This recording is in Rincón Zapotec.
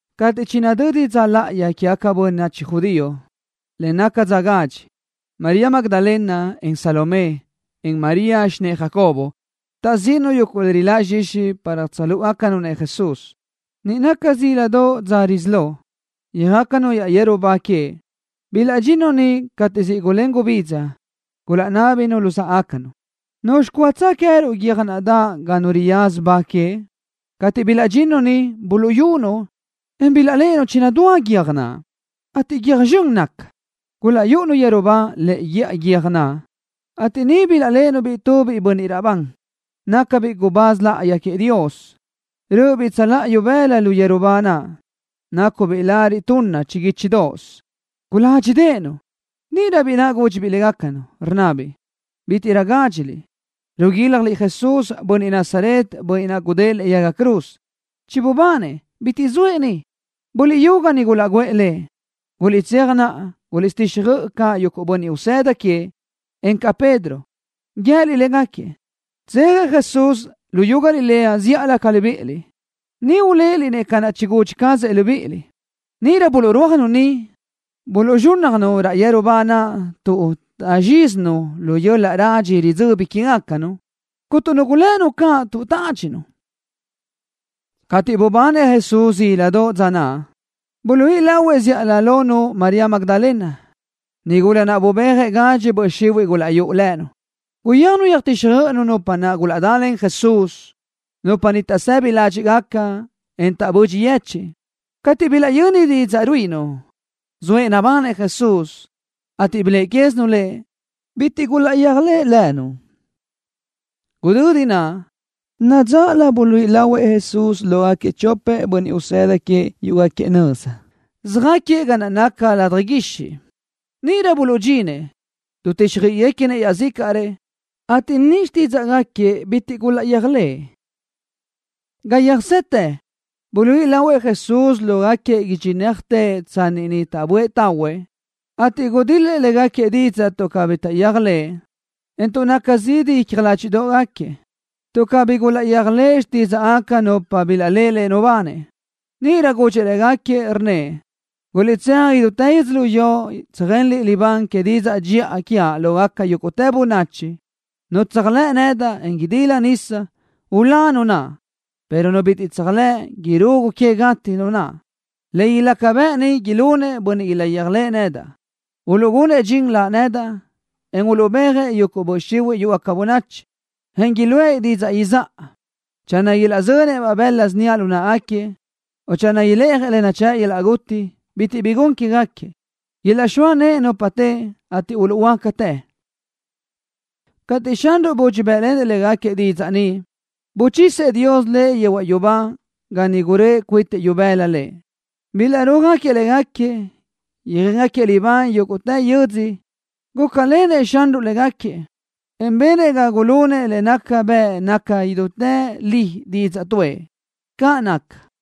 Cateʼ chinadödi dza láʼayi quégaca bönachi judío le naca dza gadxi, María Magdalena, en Salomé, en María, xinë́ʼë Jacobo, taʼzíʼinu yuguʼ le riláʼ zxixi para tsöjlúʼugacanu Jesús. Niʼ naca zíladoʼ dza risí lo, yöjácanu raʼ yeru ba queëʼ. Bilaʼdxinnu niʼ cateʼ siʼ gulén gubidza. Gulaʼnábinu luzáʼagacanu: —¿Nuzxi cúatsö queë́ruʼ guiö́j naʼ daʼ ga nu riyaza ba queëʼ? Cateʼ bilaʼdxinnu niʼ, buluʼyunu, en bilaʼléʼenu chinadúa guiö́j naʼ, ateʼ guiö́j zxön naca. Gulaʼyúʼunu yeru ba lëʼe guíʼa guiö́j naʼ, ateʼ niʼ bilaʼléʼenu-biʼ tubiʼ biʼi bönniʼ raʼbán, nácabiʼ gubáz láʼayi queëʼ Dios. Rö́ʼöbiʼ tsöláʼa ibëla lu yeru ba naʼ, nácubiʼ lariʼ tunna chiguíchidoʼos. Guládxideʼenu. Níʼirö biʼi naʼ gúdxibiʼ légacanu, rnnabiʼ: —Bítiʼrö gádxiliʼ. Ruguílajliʼ Jesús, Bönniʼ Nazaret, Bönniʼ naʼ gudë́ʼë lëʼe yaga cruz. Chibubanëʼ. Bitiʼ zoëʼ ni. Buliʼyú ga ni gulaʼguʼë Lëʼ. Guliʼtséaj naʼa, guliʼtsöjtíxjöiʼi caʼ yuguʼ bönniʼ usëda queëʼ, encaʼ Pedro. Guië́liʼ légaquiëʼ: “Tsejëʼ Jesús luyú Galilea zíʼalö ca libíʼiliʼ. Niʼ uléʼeliʼ-nëʼ ca naʼ chigudxi cazëʼ libíʼiliʼ.” Níʼirö buluʼrúajnu niʼ, buluʼzxúnnajnu raʼ yeru ba naʼ tuʼ taʼzxízinu lu yöl-laʼ radxi ridzöbi quégacanu. Cuntu nu gulënu caʼ tuʼ tádxinu. Cateʼ bubanëʼ Jesús zíladoʼ dza naʼ, buluíʼi lahuëʼ zíʼalö lonu María Magdalena, nigula naʼ bubéajëʼ gadxi böʼ xihuiʼ gulaʼyúʼu lënu. Guyéajnu yöjtíxjöiʼinu nupa naʼ gulaʼdalen Jesús. Nupa ni taʼsëbi ládxiʼgaca, en taʼbödxi yechiʼ. Cateʼ bilaʼyöni didzaʼ ruíʼinu, zoëʼ nabanëʼ Jesús, ateʼ biléʼe quézinu Lëʼ, bitiʼ gulaʼyéajlëʼ lënu. Gudödi naʼ, nadzáʼalö buluíʼi lahuëʼ Jesús lógaquiëʼ chopëʼ bönniʼ usëda queëʼ yúʼugaquiëʼ nöza, söjáquiëʼ ga naca ladaj guixiʼ. Níʼirö buluʼdxinëʼ, dutíxjöiʼiguequinëʼ iaʼzícaʼrëʼ, ateʼ ni xtídzaʼgaquiëʼ bitiʼ gulaʼyéajlëʼë. Ga yöjsetë, buluíʼi lahuëʼ Jesús lógaquiëʼ idxinéajtëʼ tsanni niʼ taʼböʼë tahuëʼ, ateʼ gudil-lëʼ légaquiëʼ didzaʼ tuʼ cabí taʼyéajlëʼë Lëʼ, en tuʼ naca zidi icja ládxiʼdoʼgaquiëʼ, tuʼ cabí gulaʼyéajlëʼë xtídzaʼgaca nupa naʼ bilaʼléʼe Lëʼ nubanëʼ. Níʼirö gudxëʼ légaquiëʼ, rnnëʼ: —Guliʼtséaj idútë yödzölió tsöjenliʼ libán que didzaʼ dxiʼa lógaca yúguʼtë bönachi. Nu tséajlëʼ nedaʼ, en idila nisa, ulá nu naʼ, pero nu bitiʼ tséajlëʼ, irugu que gati nu naʼ. Le ilaca bëʼ ni ilunëʼ bönniʼ ilaʼyéajlëʼë nedaʼ. Uluʼgunëʼ dxin Laʼ nedaʼ, en uluʼbéajëʼ yuguʼ böʼ xihuiʼ yúʼugaca bönachi, en iluʼë didzaʼ izáʼa. Channö ilaʼzönëʼ-baʼ bëla síniaʼ lu náʼagaquiëʼ, o channö ileʼjëʼ le nachë́ʼ yöl-laʼ guti, bitiʼ bi gun quégaquiëʼ. Ilaʼxóa nëʼë nupa teʼe, ateʼ uluʼhuöácatë. Cateʼ Xanruʼ budxi bë́ʼlenëʼ légaquiëʼ didzaʼ ni, buchisëʼ Dios Lëʼ yehuaʼ yubá ga niʼ guröʼë cuitëʼ ibëla Lëʼ. Bilaʼrúajëʼ légaquiëʼ, yöjéngaquiëʼ libán yúguʼtë yödzö. Gúcalenëʼ Xanruʼ légaquiëʼ, en benëʼ ga gulunëʼ le nácagaca bëʼ naca idútë li didzaʼ tuʼë. Caʼ naca.